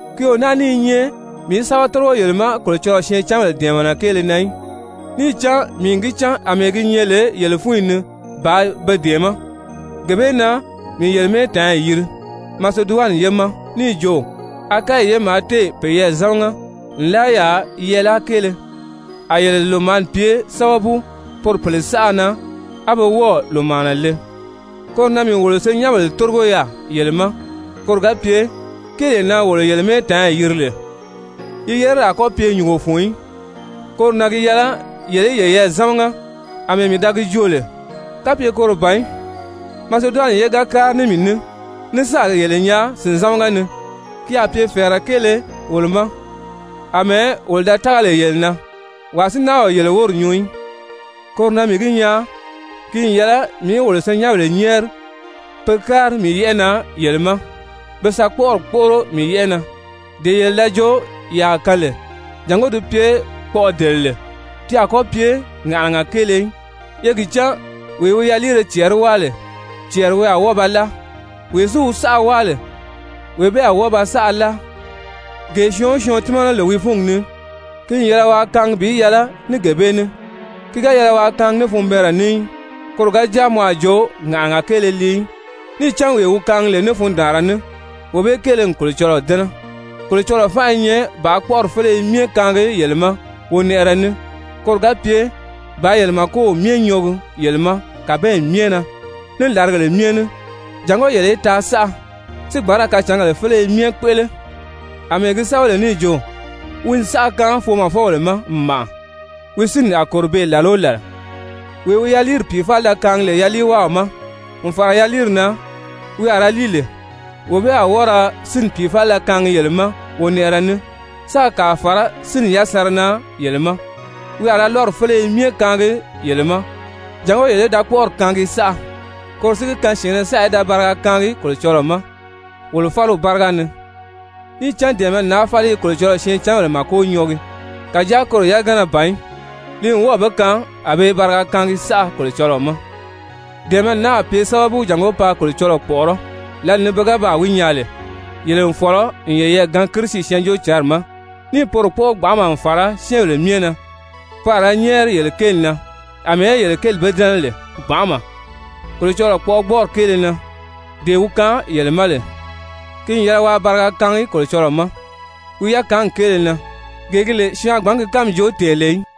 Ki o náa ní i nyɛ mii í sɛ́bɛ tórigo yele ma Kolocɔlɔɔ syɛɛncanbèle dɛ̀ɛmɛnɛ kéele na í. Níì cán mii n gi cán àmɛɛ gi nyɛ lè yele fúnyi ni bàā be dɛ̀ɛmɛ́, gee bee na mii yele mɛ́ɛtaanyi yiri Maseduwani ye ma níì jo, Akayi ye maa téè peyɛɛ zámaga nlaa yaà yɛɛláa kéele, a yele lòmaani pye sábabu poro pèle saʔa na, á be wɔ́ɔ̀ lòmaana le. Koro na mii wolo senyɛnbèle tórigo yaà yele ma, koro ga pye kéelee na wolo yele mɛ́ɛtaanyi yiri lè, yi yerili a kɔ́ pye nyùngo fun í, koro na gi yɛlɛ yele í yeyɛɛ zámaga àmɛɛ mii da gi joo lè. Kapye koro ban í, Maseduwani ye ga kári ní mii ní ní sáà yele nyaa sìnzamaga ni, ki a pye fɛ̀ɛrɛ kéele wolo ma àmɛɛ wolo da tága lè yele na, wàa si náa o yele wóri nyuu í. Koro na mii gi nyaa ki n yɛlɛ mii í wolo senyɛnbèle nyɛ́ɛri pe kári mii yɛ́ʔɛ na yele ma, be sa kpɔ́ʔɔri kpóʔoro mii yɛ́ʔɛ na, dee yele da jo ye a kaan lè, jàngó di pye kpɔʔɔdelere, ti a kɔ́ pye ŋàʔanaga kéele í. Ye gi cán, wee wi yaliire cɛɛri wáa lè, cɛɛri wi a wɔ́ɔ ba láa, wee si wi saʔa wáa lè, wee bee a wɔ́ɔ ba saʔa láa. Gee syɔɔn o syɔɔn tímana lè wi fúngi ni, ki n yɛlɛ waa kaangi bi yɛlɛ ní gee bee ní, ki ga yɛlɛ waa kaangi ní funbɛɛnrɛ ní í, koro ga jáa mɔ a jo ŋàʔanaga kéele lii í. Níì cán wee wi kaangi lè ní fundaanra ní, wee bee kéele n Kolocɔlɔɔ dɛ́nɛ. Kolocɔlɔɔ fánʔa i nyɛ bàā kpɔ́ʔɔri féleye myɛ kaangi yele ma wonɛʔɛrɛ ní, koro ga pye bàā yele màkow myɛ nyɔɔgi yele ma kàbanyi myɛ na, ní làrigèle myɛ ni, jàngó yele í taa saʔa, si gbǎn ra kacǎngèle féleye myɛ kpéʔele. Amɛɛ gi sɛ́bɛ lè níì jo: «Wi n saʔa kaan foomɔfɔbèle ma n màʔa. Wi sínni a kòro beè làla o làla.» Wee wi yaliiri pìifalida kaangi lè yaliiwáaw ma, n fàra yaliiri na wi a ra líi lè, wee bee a wɔ́ɔ ra sínni pìifalida kaangi yele ma wonɛʔɛrɛ ní, sáā kàa fàrá sínni yasanra na yele ma. Wi a ra lɔ́ri féleye myɛ kaangi yele ma, jàngó yele í da kpɔ́ʔɔri kaangi saʔa. Koro si gi kaan syɛ̀ɛnnɛ saʔa í da bariga kaangi Kolocɔlɔɔ ma wolo fáliw báriga ni. Níì cán dɛ̀ɛmɛni naa fáli i Kolocɔlɔɔ syɛɛncanbèle màko nyɔɔgi, kàjáa koro yagana ban í, li n wɔ́ɔ̀ be kaan a be i bariga kaangi saʔa Kolocɔlɔɔ ma. Dɛ̀ɛmɛni naa a pye sábabu jàngó paa Kolocɔlɔɔ kpɔ̀ʔɔrɔ́ lǎli ni pe ga baa gi nyaa lè yele n fɔ̀lɔ n yeyɛɛ gaan Kirisi Syɛɛnjóocǎnri ma, níì poro kpɔ́ʔɔ gbanʔama n fàra syɛ́ɛnbèle myɛ na. Pe a ra nyɛ́ɛri yele kéeli na àmɛɛ yele kéeli be dɛ́nɛ lè gbanʔama Kolocɔlɔɔ kpɔʔɔgbɔɔri kéele na, dee wi kaan yele ma lè. Ki n yɛlɛ waa bariga kaangi Kolocɔlɔɔ ma wi yakaangi kéele na, gee gi lè syɔɔn a gbǎn ki kánmi joo tɛ̀ɛn lè í!